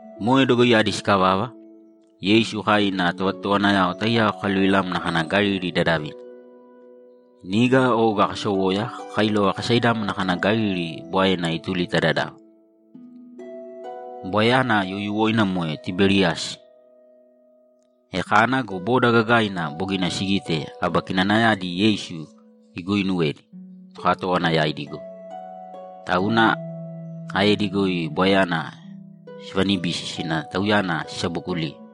Moe dogoiyadi sikavava, Yeisu kai ina tovatotowanayao taiyao kakaluvilamna kana Galili dadavina. Niga oga kasowoya kakailova kasaidámana kana Galili Bwaena ituli ta dadava. Bwaeyana youyuwoina moe Tiberiyasi. E kana go, boda gagaina bogina sigite aba kinanayadi Yeisu iguuinuwedi tokatówana yaidi goi, tauna aedi goi Bwaeyana sivanibisi sina Tauyana sisabookuliye.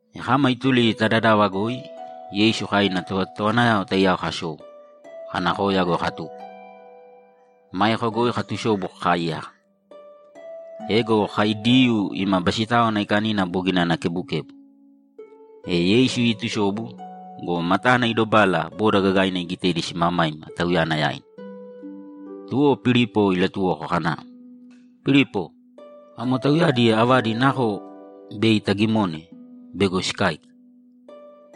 E kama ituli ta dadava goi, Yeisu kai ina tovatotowanayao taiyao kasou, kana koya goi katuko. Maeko goi katusobu kakaaiyaka. Ego kai Diyuu ima Basitáwana Aikanina bogina ana kebukebu. E Yeisu iitusobu go, matana idobala boda gagaina igitedi simamaima Tauyana yaina. Tuwo Pilipo ilatuwoko kana, ‘Pilipo, amo tauyadi avadi nako bei tagimone bego sikáika?’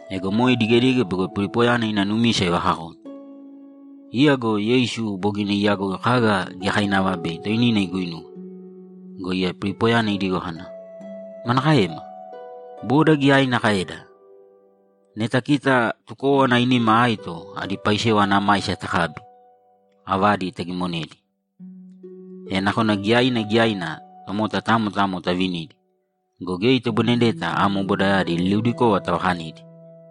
Ego moe idigedige bego Pilipoyana ina numisa ivakakone. Iya go Yeisu bogina iyagoi kaga giyakainava bei toinina iguinuwe. Go iya Pilipoyana idigo kana, ‘Manakaema? Boda giyaina kaeda! Neta kita tukówana ainima aito adi paisewa ana maisa takabi, avadi tagimonedi, e nakona giyaina giyaina tomota tamo tamo tavinidi go, geya itoboinedeta amo bodayadi liliudikova tavakanidi.’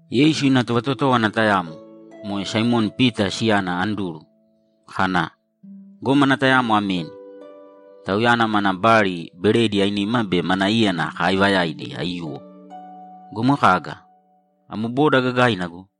Yeisu ina tovatotówana tayamo, moe Saimoni Pita siyana Anduru, kana, ‘Gómana tayamo ameni. Tauyana mana bali beredi ainima be mana íyana kaaivayaidi aiyuwo go, moe kaga? Amo boda gagaina go!’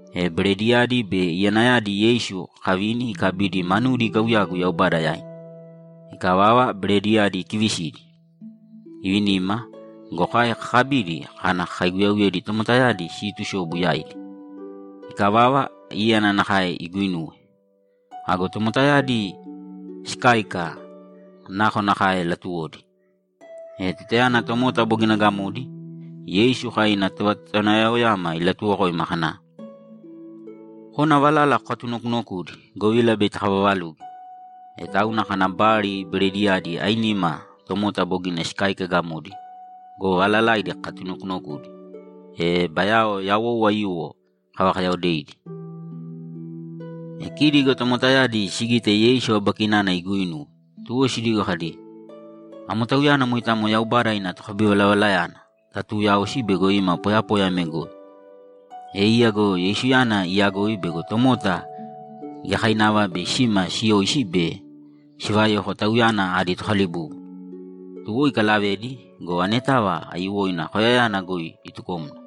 E berediyadi be iyanayadi Yeisu kavini ikabidi manudi ikauyagu Yaubada yaina. Ikavava, berediyadi ikivisidi, ivinima go, kai kakabidi kana kakaiguyauyedi tomotayadi siitusobu yaidi. Ikavava, íyana nakae iguinuwe. Ago tomotayadi sikáika nakonakae latuwodi. E tutayana tomota bogina gamodi, Yeisu kai ina tovatotowanayaoyama ilatuwokoima kana, ‘Kōna valala kokatunokunokūdi, govila bei takavavaluge.’ E tauna kana bali berediyadi ainima tomota bogina sikáika gamodi go, valalaidi kakatunokunokudi, e bayao yawou aiyuwo kavakayaodeidi. E kidi go tomotayadi sigite Yeisu aba kinana iguuinuwe, tuwo sidigo kadi, ‘Amo Tauyana moitamo Yaubada ina tokabivalavalayana tatuuyaosi bego ima poyapoya ame goi.’ E iya go Yeisuyana iyagoi bego tomota giyakainava bei sima siyoisi be sivayoko Tauyana adi tokalibúbuna, tuwo ikalavedi go, anetava aiyuwoina koyayana goi itukomna.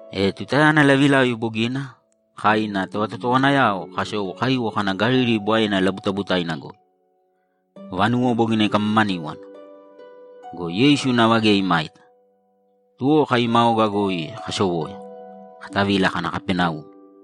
E tutayana lavilavi bogina, kai ina tovatotowanayao kasou kaiwo kana Galili Bwaena labutabutaina goi. Vanuwo bogina ikamamaníwana go, Yeisu nava geya imaita. Tuwo kai ima oga goi kasowoya, katavila kana Kapaneumi.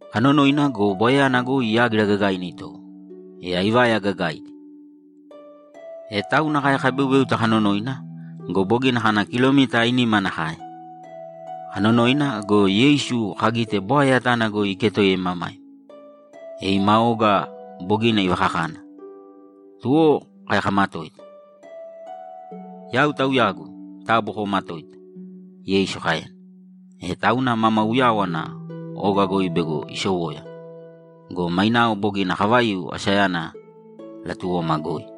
Kanonoina go, bwaeyana goi yágira gagaina itowo, e aivaya gagaidi. E tauna kai kabeubéuta kanonoina go, bogina kana kilomita ainima nakae. Kanonoina go, Yeisu kagite bwae yatana goi iketoiya imamaima, e ima oga bogina ivakakana. Tuwo kai kamatoita. ‘Yau Tauyagu! Taabu koomatōita!’ Yeisu kaena. E tauna mama uyáwana oga goi bego isowoya go, mainao bogina kavaiu asayana latuwoma goi!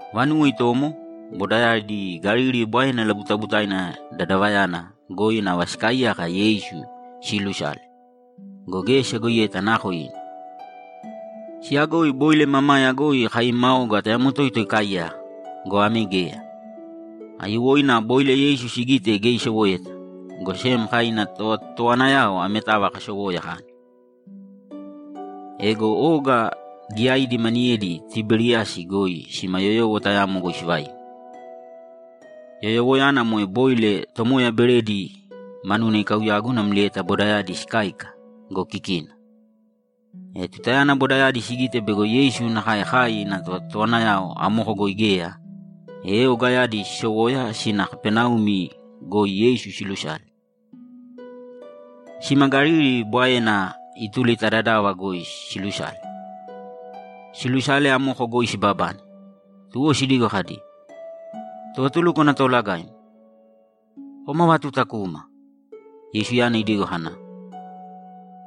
Vanuwo itomo, bodayadi Galili Bwaena labutabutaina dadavayana goi nava sikaaiyaka Yeisu siilusale go, geya siyagoiyeta nako ina. Siyagoi boile mamaya goi kai ima oga tayamo toito ikaaiyaka go, ame geya. Aiyuwoina boile Yeisu sigite geya isowoeta, go sem kai ina tovatotowanayao ametava kasowoya kana. Ego oga giyaidi maniyedi Tiberiyasi goi sima yoyowo tayamo goi sivaiu. Yoyowoyana moe boile Tomoya beredi manuna ikauyagu namlieta bodayadi sikáika go, kikina. E tutayana bodayadi sigite bego Yeisu nakae kai ina tovatotowanayao amoko goi geya, e ogayadi sisowoya sina Kapaneumi goi Yeisu silusale. Sima Galili Bwaena ituli ta dadava goi silusale. Siilusale, amoko goi sibabane, tuwo sidigo kadi, ‘Tovatulúkwana Toolagaim, kom ava tuta kuma?’ Yeisuyana idigo kana,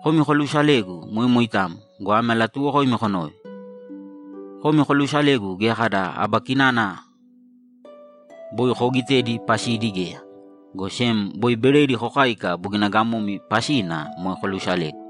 ‘Komi kolusalegu moe moitamo go, ame alatuuwokoimi konōve: Komi koluusalegu geya kada aba kinana boi koogitedi pasidi geya, go sem boi beredi kokáika bogina gamomi pasina moe kolusalegu.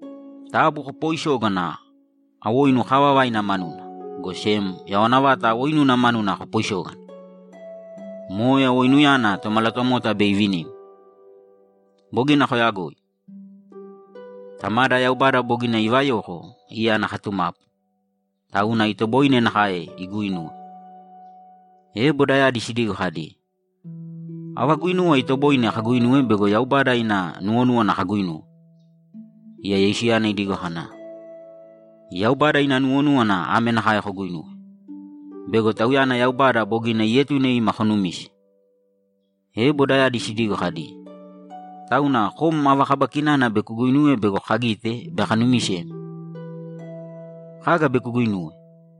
Taabu kopooisōgana awoinu kaavavaina manuna, go sem yawana vata awoinuna manuna kopooisōgana! Moe awoinuyana Tomalatomota bei ivinimi. Bogina koyagoi. Tamada Yaubada bogina ivayoko iya ana katumapu, tauna itoboine nakae iguuinuwe.’ E bodayadi sidigo kadi, ‘Ava guinuwa itoboine kaguinuwe bego Yaubada ina nuwonúwana kaguuinuwe?’ Iya Yeisuyana idigo kana, ‘Yaubada ina nuwonúwana ame nakae koguinuwe: Bego Tauyana Yaubada bogina ietune ima konumise.’ E bodayadi sidigo kadi, ‘Tauna kom ava kaba kinana bei kuguinuwe bego kagite be kanumisem? Kaga bei kuguinuwe?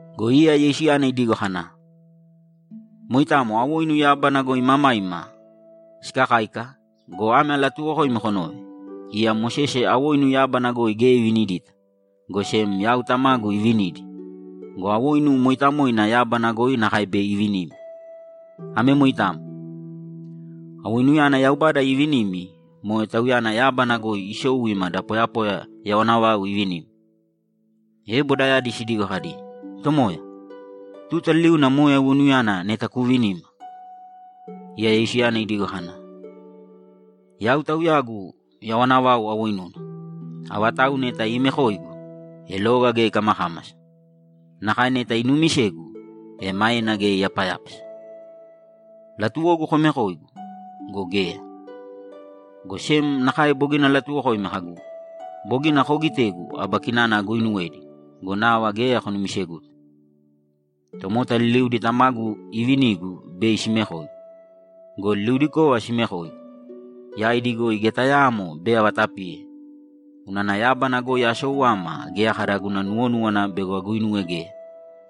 Go iya Yeisuyana idigo kana, ‘Moitamo awoinu yábana goi imamaima sikakáika go, ame alatuuwokoimi konōve: Iya Mosese awoinu yábana goi geya ivinidita, go sem yau Tamagu ivinidi go, awoinu mooitamoina yábana goi nakae bei ivinimi. Ame moitamo. Awoinuyana Yaubada iivinimi moe Tauyana yábana goi isou ima da poyapoya yawana vau ivinimi.’ E bodayadi sidigo kadi, ‘Tomoya, tuta liliuna moe awoinuyana neta kuuvinīma.’ Iya Yeisuyana idigo kana, ‘Yau Tauyagu yawana vau awoinuna. Avatau neta iimekoigu, e loga geya ikamakámasa. Nakae neta inuumisegu, e maena geya iyapayápasa. Latuwogu komekoigu go, geya. Go sem nakae bogina alatuwokoimi kagu, “Bogina koogitegu aba kinana aguuinuwedi go, nava geya konumiseguta.” Tomota liliudi Tamagu iivinigu bei simekoigu. Go liliudikova siimekoigu, yaidi goi geya tayaamo bei avatapiye. Unana yábana goi asou ama geya kada guna nuwonúwana bego aguinuwe geya,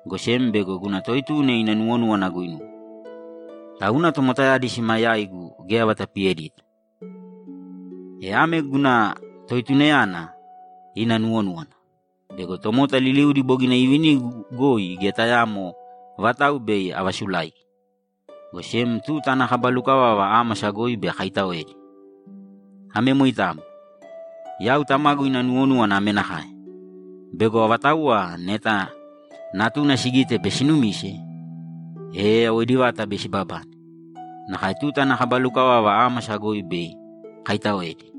go sem bego guna Toetuna ina nuwonúwana aguinuwe. Tauna tomotayadi sima yaigu geya avatapiyedita. E ame guna Toetunayana ina nuwonúwana: Bego tomota liliudi bogina iivinigu goi geya tayaamo vatau bei avaasulaigi, go sem tuta ana kaba lukavava ámasa goi bei akaitaoedi. Ame moitamo. Yau Tamagu ina nuwonúwana ame nakae: Bego avatauwa neta Natuna sigite be sinumise, e yawoidi vata bei sibabane, nakae tuta ana kaba lukavava ámasa goi bei akaitaoedi.’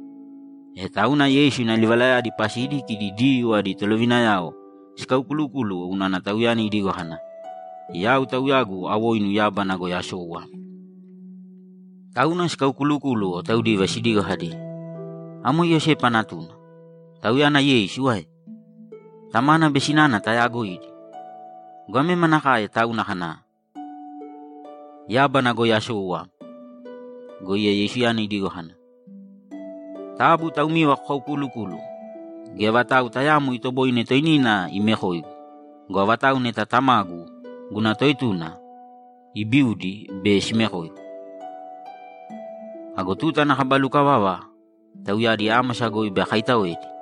E tauna Yeisu ina livalayadi pasidi kidi Diyuu adi tolovinayao sikaukulukúluwo unana Tauyana idigo kana, ‘Yau Tauyagu awoinu yábana goi asou ama.’ Tauna sikaukulukúluwo taudiva sidigo kadi, ‘Amo Iyosepa natuna, Tauyana Yeisu ae? Tamana be sinana tayaagoidi go, ame manakae tauna kana, “Yábana goi asou ama”?’ Go iya Yeisuyana idigo kana, ‘Taabu taumiva kokaukuulukūluwo! Geya vatau tayaamo itoboine toinina imekoigu go, avatauwa neta Tamagu, guna Toetuna, ibiudi, bei simekoigu. Ago tuta ana kaba lukavava tauyadi ámasa goi bei akaitaoedi.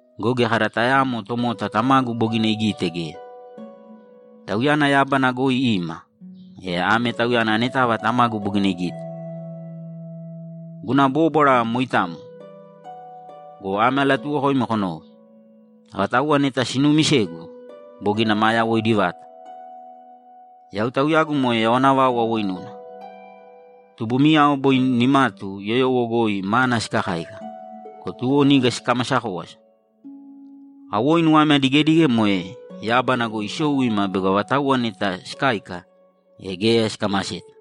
Go geya kada tayaamo tomota Tamagu bogina igite geya. Tauyana Yaubada goi ima, e ame Tauyana anetava Tamagu bogina igite. Guna bóbwara moitamo go, ame alatuuwokoimi konōve: Avatauwa neta sinuumisegu, bogina maa yawoidi vata. Yau Tauyagu moe yawana vau awoinuna. Tubumiyao boi nimatu yoyowo goi mana sikakáika go, tuwo niga sikamasa kówasa. Awoinu ame adigedige moe yábana goi isou ima bego avatauwa neta sikáika, e geya sikamaseta.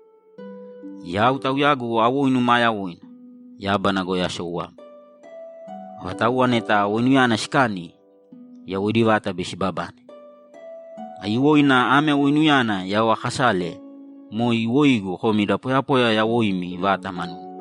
Yau Tauyagu awoinu maa yawoina, yábana goi asou ama. Avatauwa neta ame awoinuyana sikani, yawoidi vata bei sibabane. Aiyuwoina ame awoinuyana yau aakasale moe iwoigu komi da poyapoya yawoimi vata manuna.’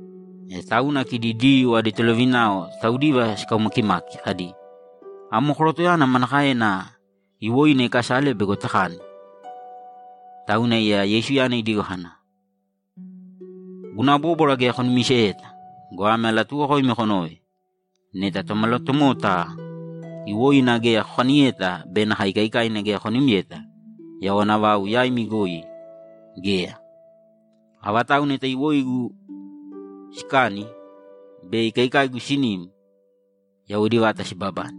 E tauna kidi Diyuu adi tolovinayao taudiva sikaumakimaki kadi, ‘Amo korotoyana manakaena iwoina ikasale bego takani?’ Tauna iya Yeisuyana idigo kana, ‘Guna bóbwara geya konumiseyeta go, ame alatuuwokoimi konōve: Neta Tomalatomota iwoina geya kokaniyeta be nakae ikaikaina geya konimyeta, yawana vau yaimi goi geya. Avatauwa neta iwoigu sikani be ikaikaigu sinim, yawoidi vata sibabane,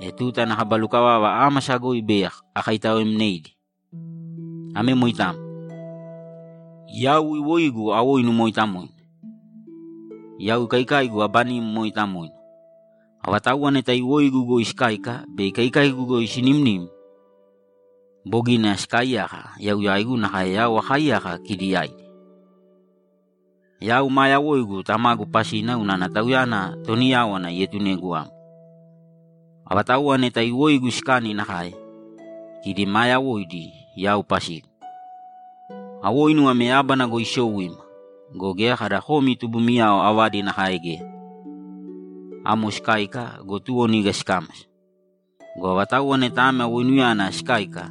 e tuta ana kaba lukavava ámasa goi bei akaitaoemneidi. Ame moitamo. Yau iwoigu awoinu mooitamoina. Yau ikaikaigu aba nim mooitamoina. Avatauwa neta iwoigu goi sikakáika be ikaikaigu goi sinimnim, bogina sikaaiyaka yau yaigu nakae yau akaaiyaka kidi yaidi. Yau maa yawoigu Tamagu pasina unana Tauyana toni yáwana ietunegu ama. Avatauwa neta iwoigu sikani nakae; kidi maa yawoidi yau pasigu. Awoinu ame yábana goi isou ima go, geya kada komi tubumiyao avadi nakae geya. Amo sikáika go, tuwo niga sikámasa. Go avatauwa neta ame awoinuyana sikáika,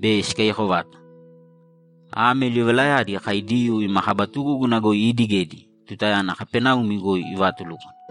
bei sikaiyako vata.’ Ame livalayadi kai Diyuu ima kaba tugúguna goi iidigedi tutayana Kapaneumi goi ivaatulúkwana.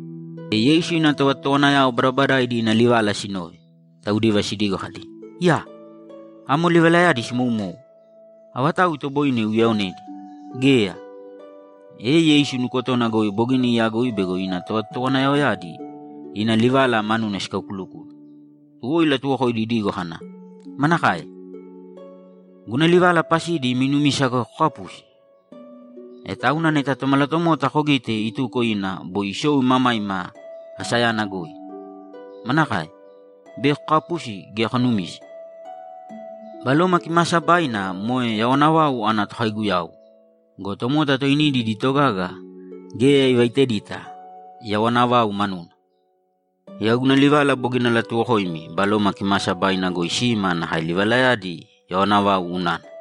E Yeisu ina tovatotowanayao badabadaidi ina livala sinove, taudiva sidigo kadi, ‘Iyaa! Amo livalayadi simoumou. Avatau itoboine iuyaonedi? Geya!’ E Yeisu nukotona goi bogina iyagoi bego ina tovatotowanayaoyadi ina livala manuna sikulukúluwo. Tuwo ilatuwokoidi idigo kana, ‘Manakae? Guna livala pasidi imi numisa goi kokapusi? E tauna neta Tomalatomota kogite ituko ina boi isou imamaima asayana goi, manakae? Bei kokapusi gea konumise? Baloma Kimaasabaina moe yawana vau ana tokaiguyau go, tomota toinidi idi togaga geya ivaitedita yawana vau manuna. Yau guna livala bogina alatuwokoimi Baloma Kimaasabaina goi sima nakae livalayadi yawana vau unana.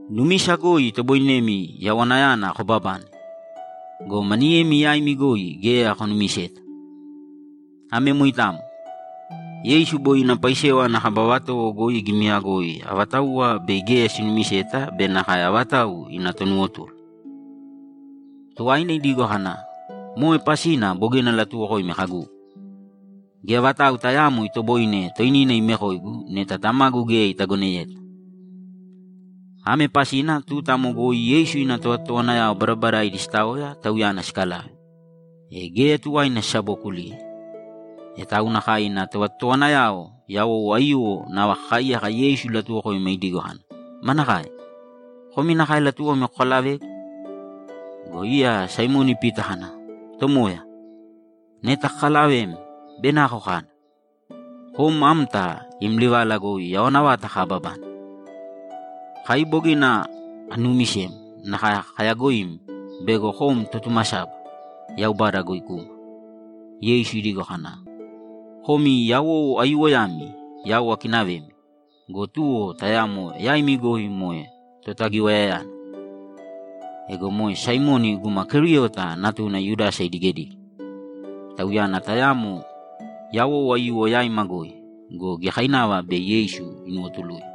Numisa goi itoboinemi yawanayana kobabane go, maniyemi yaimi goi geya konumiseta.’ Ame moitamo. Yeisu boi ina paisewa ana kaba vatowo goi igimiyagoi avatauwa bei geya sinumiseta be nakae avatau ina tonuwotulu. Tuwaina idigo kana, ‘Moe pasina bogina alatuwokoimi kagu, “Geya vatau tayaamo itoboine toinina imekoigu neta Tamagu geya itagoneyeta.”’ Ame pasina tuta amo goi Yeisu ina tovatotowanayao badabadaidi sitaoya Tauyana sikalave, e geya tuwaina sisabookuliye. E tauna kai ina tovatotowanayao yawou aiyuwo nava kakaaiyaka Yeisu ilatuwokoima idigo kana, ‘Manakae? Komi nakae latuwomi kokalavegu?’ Go iya Saimoni Pita kana, ‘Tomoya, neta kakalavem, bei nako kana? Kom amta im livala goi yawana vata kababane. Kai bogina kanuumisem nakae kayaagoim bego kom Totumasaba, Yaubada goi kuma.’ Yeisu idigo kana, ‘Komi yawou aiyuwoyami, yau akinavemi go, tuwo tayamo yaimi goi moe Totagiwayayana.’ Ego moe Saimoni guma Keriota natuna Yudasa idigedige. Tauyana tayamo yawou aiyuwo yaima goi go, giyakainava bei Yeisu inuwotuluye.